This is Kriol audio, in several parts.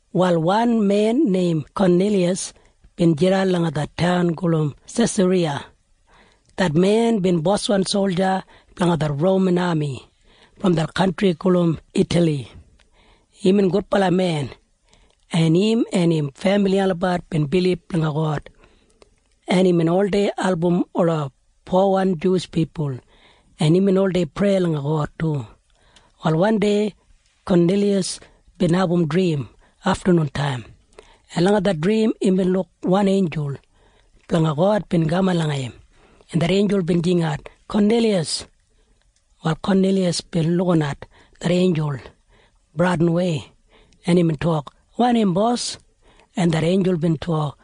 Wal wan men neim Koniliyas bin jidan langa det taun gulum Sesariya. Det men bin boswan solja blanga det Roman ami brom det kantri gulum Itali. Imbin gudbala men, en im en im femili olabat bin bilib langa God, en imbin oldei album ola powan Juwish pipul, en imbin oldei prei langa God du. Wal wandei Koniliyas bin abum drim aftanuntaim, en langa det drim imbin luk wan einjul blanga God bin kaman langa im, en det einjul bin jingat, “Koniliyas!” Wal Koniliyas bin lukinat det einjul bradinwei, en imbin tok, “Wanim, bos?” En det einjul bin tok,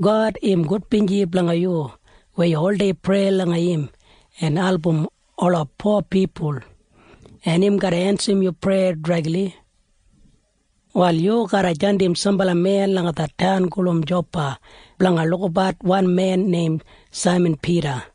“God im gudbinji langa yu weya yu oldei prei langa im en album ola po pipul, en im garra ensim yu preya dregli. Wal yu garra jandim sambala men langa det taun gulum Jopa blanga lukabat wan men neim Saiman Pida.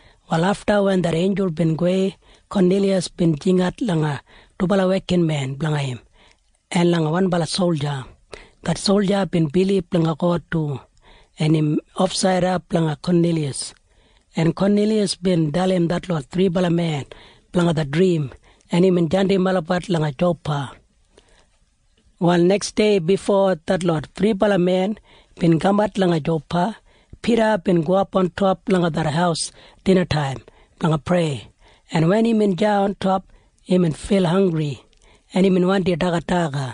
Wal afta wen det einjul bin gowei, Koniliyas bin jingat langa dubala wekinmen blanga im en langa wanbala solja. Det solja bin bilib langa God du, en imbin ofsaida blanga Koniliyas, en Koniliyas bin dalim detlot thribala men blanga det drim, en imbin jandim olabat langa Jopa. Wal neksdei bifo detlot thribala men bin kamat langa Jopa, Pida bin gowap ontop langa det haus dinataim blanga prei, en wen imbin deya ontop, imbin fil hanggri, en imbin wandi dagat daga.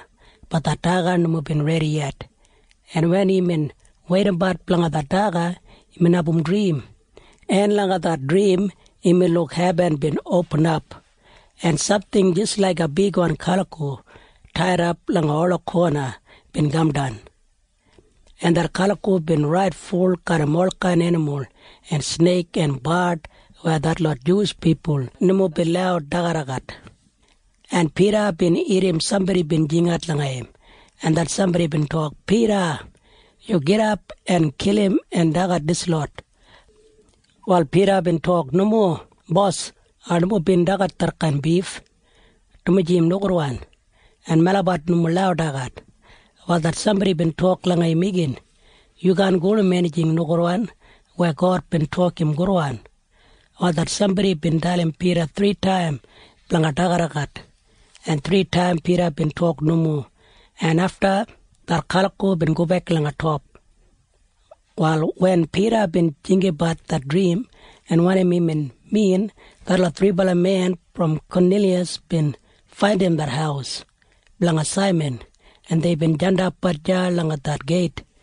Bat det daga nomo bin redi yet, en wen imbin weidabat blanga det daga, imbin abum drim, en langa det drim imbin luk hebin bin opinap, en samting jis laiga bigwan kaliko taidap langa ola kona bin kamdan, en det kaliko bin rait ful garram olkain enimul en sneik en bard weya detlot Juwish pipul nomo bin lau dagadagat, en Pida bin irrim sambodi bin jingat langa im, en det sambodi bin tok, “Pida, yu gidap en kilim en dagat dislot.” Wal Pida bin tok, “Nomo, Bos. Ai nomo bin dagat detkain bif, dumaji im nogudwan, en melabat nomo lau dagat.” Wal det sambodi bin tok langa im igin, “Yu kaan gulum enijing nogudwan weya God bin tok im gudwan.” Wal det sambodi bin dalim Pida thritaim blanga dagadagat, en thritaim Pida bin tok nomo, en afta det kaliko bin gobek langa top. Wal wen Pida bin jinggabat det drim en wanim imbin min, detlot thribala men brom Koniliyas bin faindim det haus blanga Saiman, en deibin jandapbat deya langa det geit,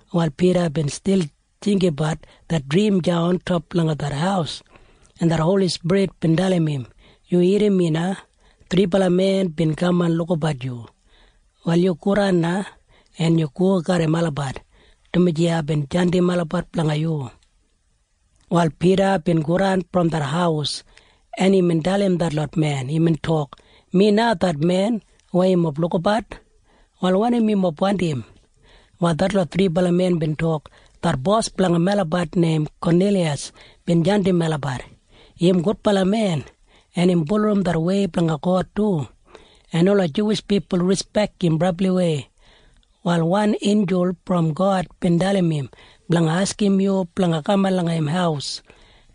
Wal Pida bin stil jinggabat det drim deya ontop langa det haus, en det Holi Spirit bin dalim im, “Yu irrim mi na. Thribala men bin kaman lukabat yu. Wal yu godan na, en yu go garram olabat, dumaji aibin jandim olabat langa yu.” Wal Pida bin godan brom det haus, en imbin dalim detlot men. Imbin tok, “Mi na det men weya yumob lukabat. Wal wanim yumob wandim?” Wal detlot thribala men bin tok, “Det bos blanga melabat neim Koniliyas bin jandim melabat. Im gudbala men, en im bulurrum det wei blanga God du, en ola Juwish pipul rispek im brabliwei. Wal wan einjul brom God bin dalim im blanga askim yu blanga kaman langa im haus,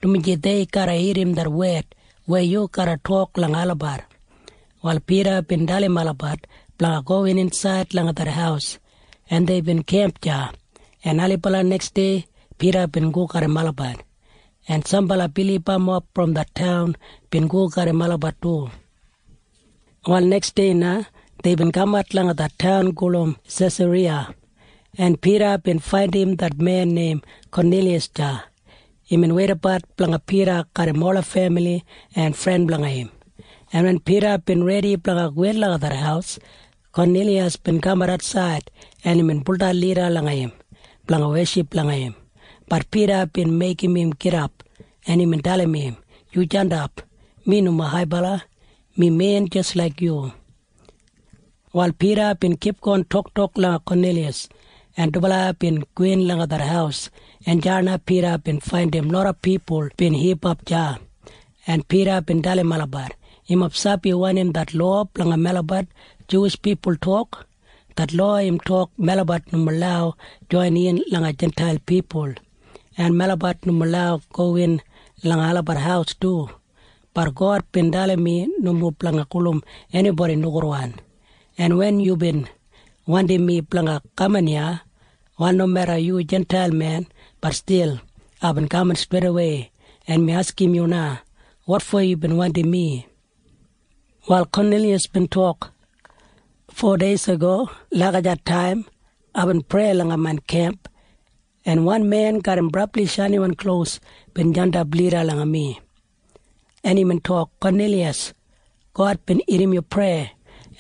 dumaji dei garra irrim det wed weya yu garra tok langa olabat.” Wal Pida bin dalim olabat blanga gowin insaid langa det haus, en deibin kemp deya, en ailibala neksdei Pida bin go garram olabat, en sambala bilibamob brom det taun bin go garram olabat du. Wal neksdei na deibin kamat langa det taun gulum Sesariya, en Pida bin faindim det men neim Koniliyas deya. Imbin weidabat blanga Pida garram ola femili en fren blanga im, en wen Pida bin redi blanga gowin langa det haus, Koniliyas bin kamat atsaid, en imbin baudan lida langa im blanga weship langa im. Bat Pida bin meigim im gidap, en imbin dalim im, “Yu jandap. Mi nomo haibala. Mi men jis laik yu.” Wal Pida bin kipgon toktok langa Koniliyas, en dubala bin gowin langa det haus, en deya na Pida bin faindim loda pipul bin hipap deya, en Pida bin dalim olabat, “Yumob sabi wanim det lowa blanga melabat Juwish pipul tok. Det lowa im tok melabat nomo lau joinin langa Jintail pipul, en melabat nomo lau gowin langa olabat haus du. Bat God bin dalim mi nomo blanga gulum enibodi nogudwan, en wen yubin wandim mi blanga kaman iya, wal nomeda yu Jintail men, bat stil aibin kaman streidawei. En mi askim yu na. Wotfo yubin wandim mi?” Wal Koniliyas bin tok, “Fodeisago lagijat taim aibin prei langa main kemp, en wan men garram brabli shainiwan klos bin jandap lida langa mi, en imbin tok, ‘Koniliyas, God bin irrim yu preya,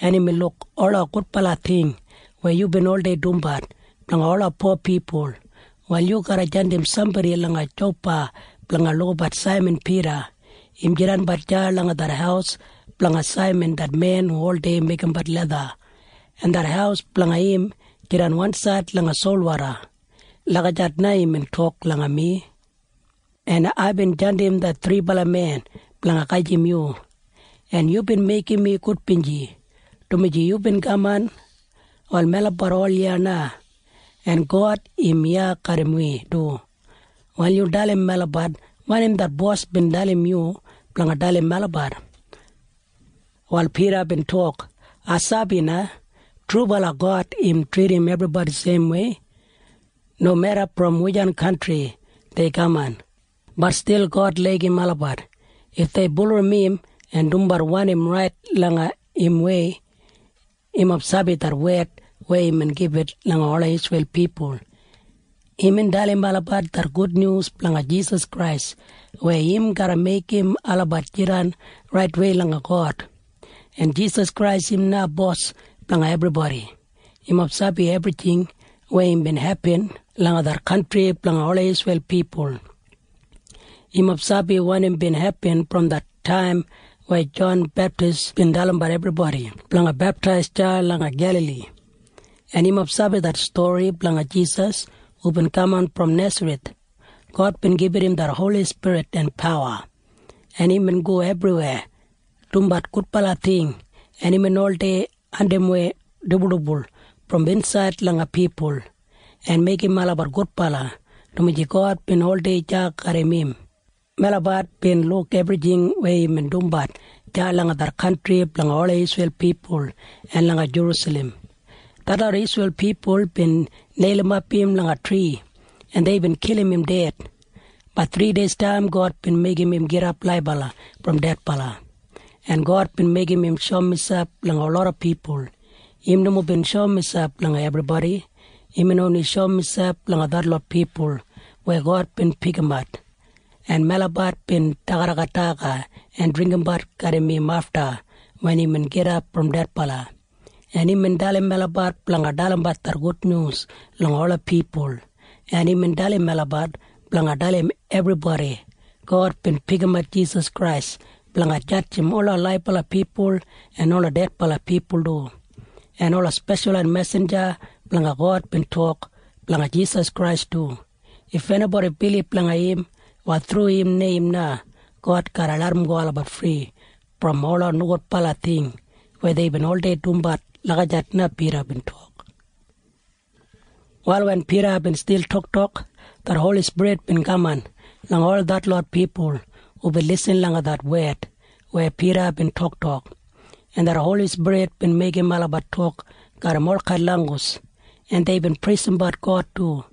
en imbin luk ola gudbala ting weya yubin oldei dumbat blanga ola po pipul. Wal yu garra jandim sambodi langa Jopa blanga lukabat Saiman Pida. Im jidanbat deya langa det haus blanga Saiman det men hu oldei meigimbat letha, en det haus blanga im jidan wansaid langa solwoda.’ Lagijat na imbin tok langa mi, en aibin jandim det thribala men blanga gajim yu, en yubin meigim mi gudbinji, dumaji yubin kaman. Wal melabat ol iya na, en God im iya garram wi du. Wal yu dalim melabat wanim det bos bin dalim yu blanga dalim melabat.” Wal Pida bin tok, “Ai sabi na. Trubala God im tridim ebribodi seimwei. Nomeda brom wujan kantri dei kaman, bat stil God laigim olabat if dei bulurrum im en dumbat wanim rait langa imwei. Yumob sabi det wed weya imbin gibit langa ola Isreil pipul. Imbin dalim olabat det gudnyus blanga Jisas Krais weya im garra meigim olabat jidan raitwei langa God, en Jisas Krais im na Bos blanga ebribodi. Yumob sabi ebrijing weya bin hepin langa det kantri blanga ola Isreil pipul. Yumob sabi wanim bin hepin brom det taim weya Jon Beptis bin dalimbat ebribodi blanga beptais deya langa Gelali. En yumob sabi det stori blanga Jisas hubin kaman brom Nesareth. God bin gibit im det Holi Spirit en pawa, en imbin go ebriweya dumbat gudbala ting, en imbin oldei andimwei dibuldibul brom insaid langa pipul en meigim olabat gudbala, dumaji God bin oldei deya garram im. Melabat bin luk ebrijing weya imbin dumbat deya langa det kantri blanga ola Isreil pipul en langa Jerusalem. Detlot Isreil pipul bin neilimap im langa tri, en deibin kilim im ded. Bat thrideistaim God bin meigim im gidap laibala brom dedbala, en God bin meigim im shoum miselp langa loda pipul. Im nomo bin shoum miselp langa ebribodi. Imbin oni shoum miselp langa detlot pipul weya God bin pikimat, en melabat bin dagadagat daga en dringgimbat garram im afta wen imbin gidap brom dedbala, en imbin dalim melabat blanga dalimbat det gudnyus langa ola pipul, en imbin dalim melabat blanga dalim ebribodi, ‘God bin pikimat Jisas Krais blanga jadjim ola laibala pipul en ola dedbala pipul du.’ En ola speshalwan mesinja blanga God bin tok blanga Jisas Krais du. If enibodi bilib langa im, wal thru im neim na God garra larramgo olabat fri brom ola nogudbala ting weya deibin oldei dumbat.” Lagijat na Pida bin tok. Wal wen Pida bin stil toktok, det Holi Spirit bin kaman langa ol detlot pipul hubin lisin langa det wed weya Pida bin toktok, en det Holi Spirit bin meigim olabat tok garram olkain langgus, en deibin preisimbat God du.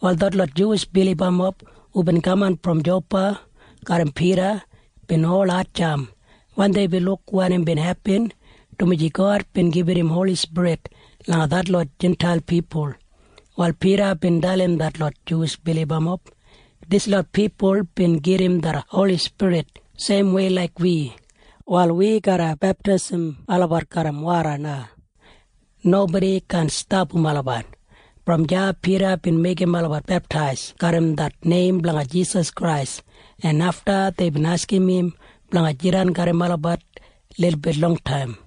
Wal detlot Juwish bilibamob hubin kaman brom Jopa garram Pida bin ol hatjamp wen deibin luk wanim bin hepin, dumaji God bin gibit im Holi Spirit langa detlot Jintail pipul. Wal Pida bin dalim detlot Juwish bilibamob. “Dislot pipul bin gedim det Holi Spirit seimwei laik wi. Wal wi garra beptaisim olabat garram woda na. Nobodi kaan stapam olabat.” Brom deya Pida bin meigim olabat beptais garram det neim blanga Jisas Krais, en afta deibin askim im blanga jidan garram olabat lilbit longtaim.